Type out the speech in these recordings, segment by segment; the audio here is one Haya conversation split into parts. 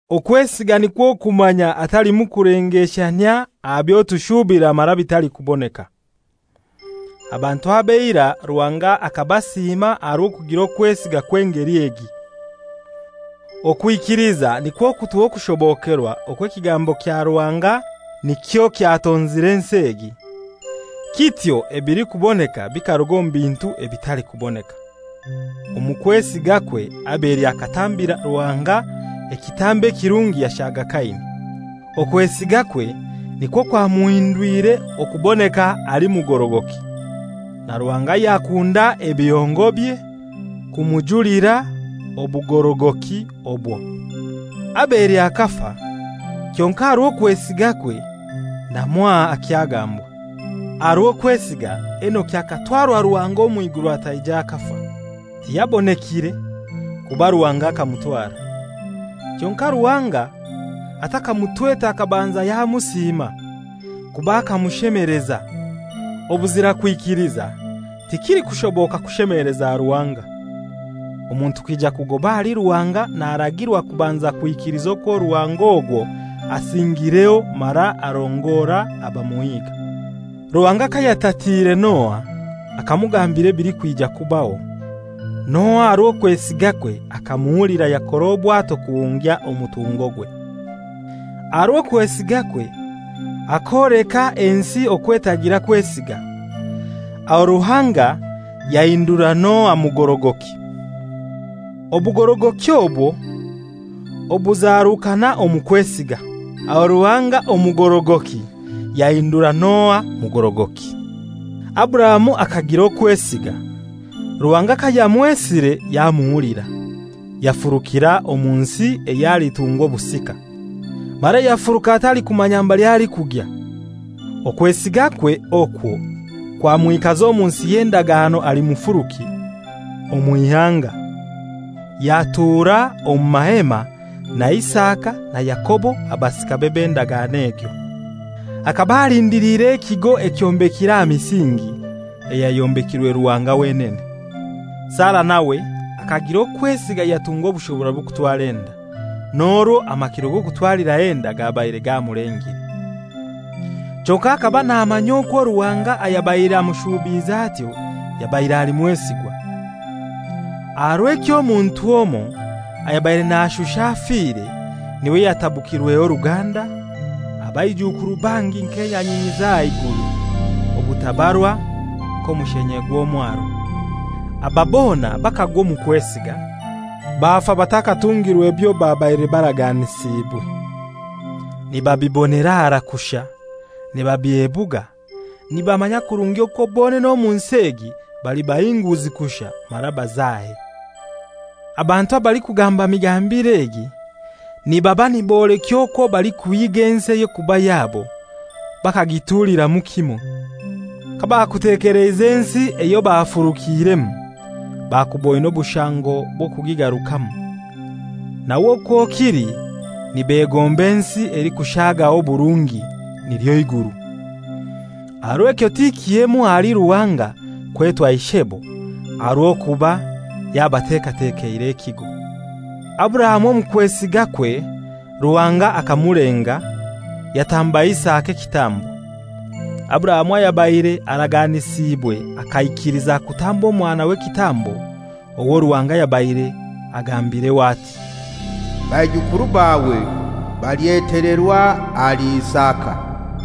Okwesiga nikwo kumanya hatalimu kulengeshanyia aha byo tushuubira mara bitalikuboneka. Abantu ab'eira Ruhanga akabasiima aha rw'okugira okwesiga kw'engeli egi. Okwikiliza nikwo kutuha okushobokerwa okwo ekigambo kya Ruhanga nikyo kyatonzire ensi egi, kityo ebilikuboneka bikaruga omu bintu ebitalikuboneka. Omu kwesigakwe Abeli akatambira Ruhanga ekitambo ekirungi yashaga Kaini. Okwesigakwe nikwo kwamuhindwire okuboneka ali mugorogoki, na Ruhanga yakunda ebihongobye kumujulira obugorogoki obwo. Abeli akafa, kyonkai aha rw'okwesigakwe na mwaha akyagambwa. Aha rw'okwesiga, Enoki akatwara Ruhanga omw'iguru ataija akafa. Tiyabonekire, kuba Ruhanga akamutwara. Kyonkai Ruhanga atakamutwete akabanza yamusiima, kuba akamushemeleza. Obuzira kwikiliza tikilikushoboka kushemeleza Ruhanga. Omuntu kwija kugoba ahali Ruhanga naragirwa kubanza kwikiliza okwo Ruhanga ogwo asingireho mara arongora abamuhiga. Ruhanga kayatatiire Noa, akamugambira ebilikwija kubaho, Noa aha rw'okwesigakwe akamuhulira yakora obwato kuhungya omutungogwe. Aha rw'okwesigakwe akoleka ensi okwo etagira kwesiga. Aho Ruhanga yahindura Noa mugorogoki, obugorogoki obwo obuzarukana omu kwesiga. Aho Ruhanga omugorogoki yahindura Noa mugorogoki. Aburahamu akagira okwesiga, Ruhanga kayamwesire yamuhulira, yafurukira omu nsi eyo alitungwa obusika, mara yafuruka atalikumanya mbali alikugya. Okwesigakwe okwo kwamwikaza omu nsi y'endagano ali mufuruki, omw'ihanga, yatura omu mahema na Isaka na Yakobo abasikabe b'endagano egyo. Akaba alindiliire ekigo ekyombekire aha misingi, eyayombekirwe Ruhanga wenene. Sara nawe akagira okwesiga yatungwa obushobora bw'okutwara enda, n'orwo amakiro g'okutwaliraho enda gabaire gamulengire. Kyonkai akaba namanya okwo Ruhanga ayabaire amushubiize atyo yabaire ali mwesigwa. Aha rw'ekyo omuntu omoi, ayabaire nashusha afire, n'iwe yatabukirweho oruganda, abaijukuru bangi nk'enyanyinyi z'aha iguru, obutabarwa nk'omushenye gw'omwaro. Aba bona bakagwa omu kwesiga, bafa batakatungirwe byo babaire baraganisiibwe, nibabibonera harai kushai, nibabyebuga, nibamanya kurungi okwo bonene omu nsi egi bali bahinguzi kushai mara bazahe. Abantu abalikugamba migambire egi nibaba nibolekya okwo balikuhiga ensi ey'okuba yabo bakagituliramu kimoi. Kabakutekeleize ensi eyo bafurukiiremu, bakuboine obushango bw'okugigarukamu. Nawe okwo kili nibegomba ensi elikushagaho oburungi, nilyo iguru. Aha rw'ekyo ti kihemu ahali Ruhanga kwetwa ishebo, aha rw'okuba yabatekatekeire ekigo. Aburahamu omu kwesigakwe Ruhanga akamulenga, yatamba Isaka ekitambo. Aburahamu ayabaire araganisiibwe akaikiliza kutamba omwanawe ekitambo, owo Ruhanga yabaire agambireho ati, «Baijukuru bawe balyetelerwa ahali Isaka.»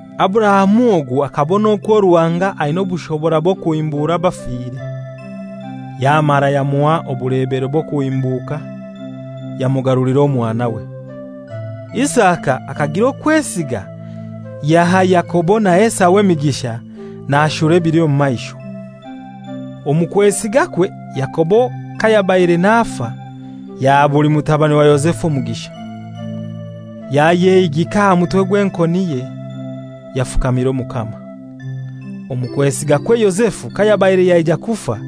Aburahamu ogu akabona okwo Ruhanga aina obushobora bw'okuhimbura abafire: Yamara yamuha obulebero bw'okuhimbuka, yamugarulira omwanawe. Isaka akagira okwesiga yaha Yakobo na Esau emigisha nashura ebili omu maisho. Omu kwesigakwe Yakobo kayabaire nafa, yaha buli mutabani wa Yozefu omugisha. Yayehigika aha mutwe gw'enkoniye, yafukamira Omukama. Omu kwesigakwe Yozefu kayabaire yaija kufa,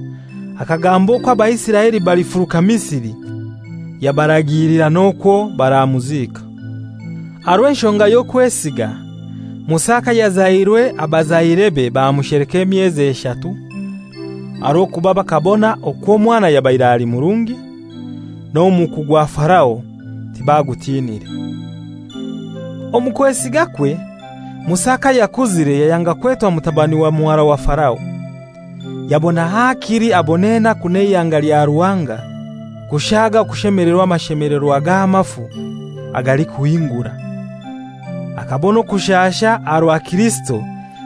akagamba okwo Abaisiraeli balifuruka Misiri, yabaragiilira n'okwo baramuziika. Aha rw'enshonga y'okwesiga Musa kayazairwe abazairebe bamusheleka emyezi eshatu, aha rw'okuba bakabona okwo omwana yabaire ali murungi, n'omuku gwa Farao tibagutiinire. Omu kwesigakwe Musa kayakuzire yayanga kwetwa mutabani wa muhara wa Farao, yabona hakili abone enaku n'eihanga lya Ruhanga kushaaga okushemelerwa amashemelerwa g'amafu agalikuhingura. Akabona okushasha aha rwa Kirisito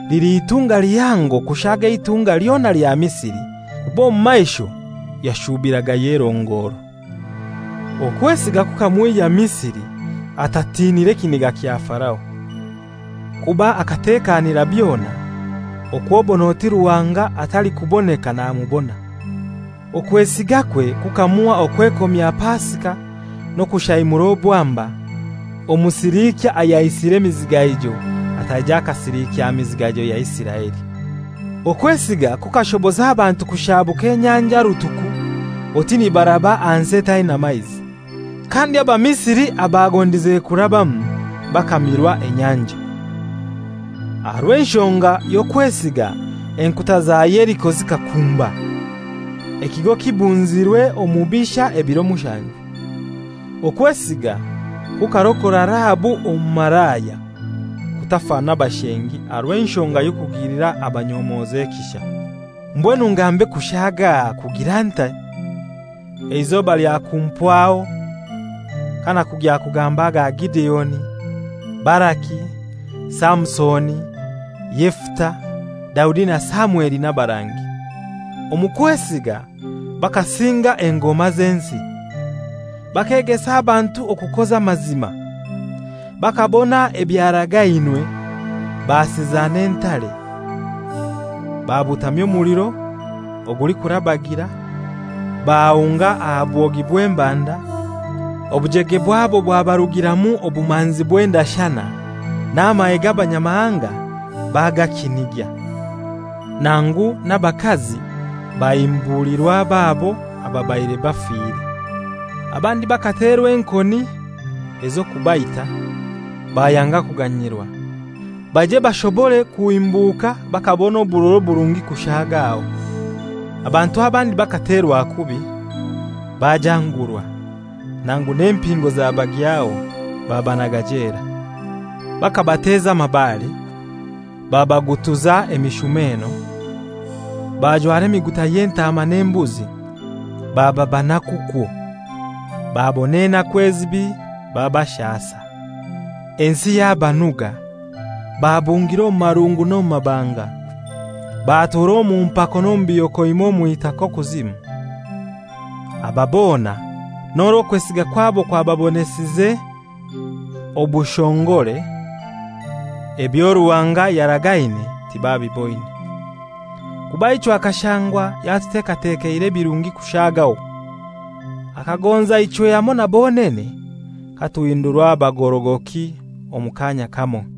lili itunga lihango kushaaga eitunga lyona lya Misiri, kuba omu maisho yashubiragayo erongoro. Okwesiga kukamwihya Misiri atatinire kiniga kya Farao; kuba akatekanira byona okw'obon'oti Ruhanga atalikuboneka namubona. Okwesigakwe kukamuha okwekomya Pasika n'okushaimura obwamba, Omusiliikya ayaisire emizigaijo ataija akasilikya mizigaijo ya Isiraeli. Okwesiga kukashoboza abantu kushabuka Enyanja Rutuku oti nibaraba aha nsi etaina maizi; kandi Abamisiri abagondize kurabamu bakamirwa enyanja. Aha rw'enshonga y'okwesiga enkuta za Yeriko zikakumba, ekigo kibunzirwe omubisha ebiro mushanju. Okwesiga kukarokora Rahabu omumalaya, kutafa na bashengi, aha rw'enshonga y'okugilira abanyomozi ekisha. Mbwenu ngambe kushagaha kugira ntai? Eizoba lyakumpwaho kanakugya kugamba aga Gideoni, Baraki, Samusoni, Yefuta, Daudi na Samweli n'abarangi. Omu kwesiga bakasinga engoma z'ensi, bakegesa abantu okukoza amazima, bakabona ebyaragainwe, basiza n'entare, babutamya omuliro ogulikurabagira, bahunga aha bwogi bw'embanda, obujege bwabo bwabarugiramu obumanzi bw'endashana, n'amahe g'abanyamahanga bagakinigya. Nangu n'abakazi bahimbulirwa ababo ababaire bafire. Abandi bakaterwa enkoni ez'okubaita, bayanga kuganyirwa, baije bashobore kuhimbuka bakabona oburora oburungi kushaagaho. Abantu abandi bakaterwa kubi, bajangurwa; nangu n'empingo zabagyaho, babanaga jela. Bakabateza amabaare, babagutuza emishumeno, bajwara emiguta y'entaama n'embuzi, baba banaku kwo, babona enaku ezibi babashasa, ensi yabanuga, babungira omu marungu n'omu mabanga, batura omu mpako n'omu bihokoima omw'itaka okuzimu. Aba bona n'orwo okwesiga kwabo kwababonesize obushongore, ebyo Ruhanga yaragaine tibabiboine. Kuba ichwe akashangwa yatutekatekeire ebirungi kushaagaho. Akagonza ichwe hamoi na bonene katunhindurwa bagorogoki omu kaanya kamoi.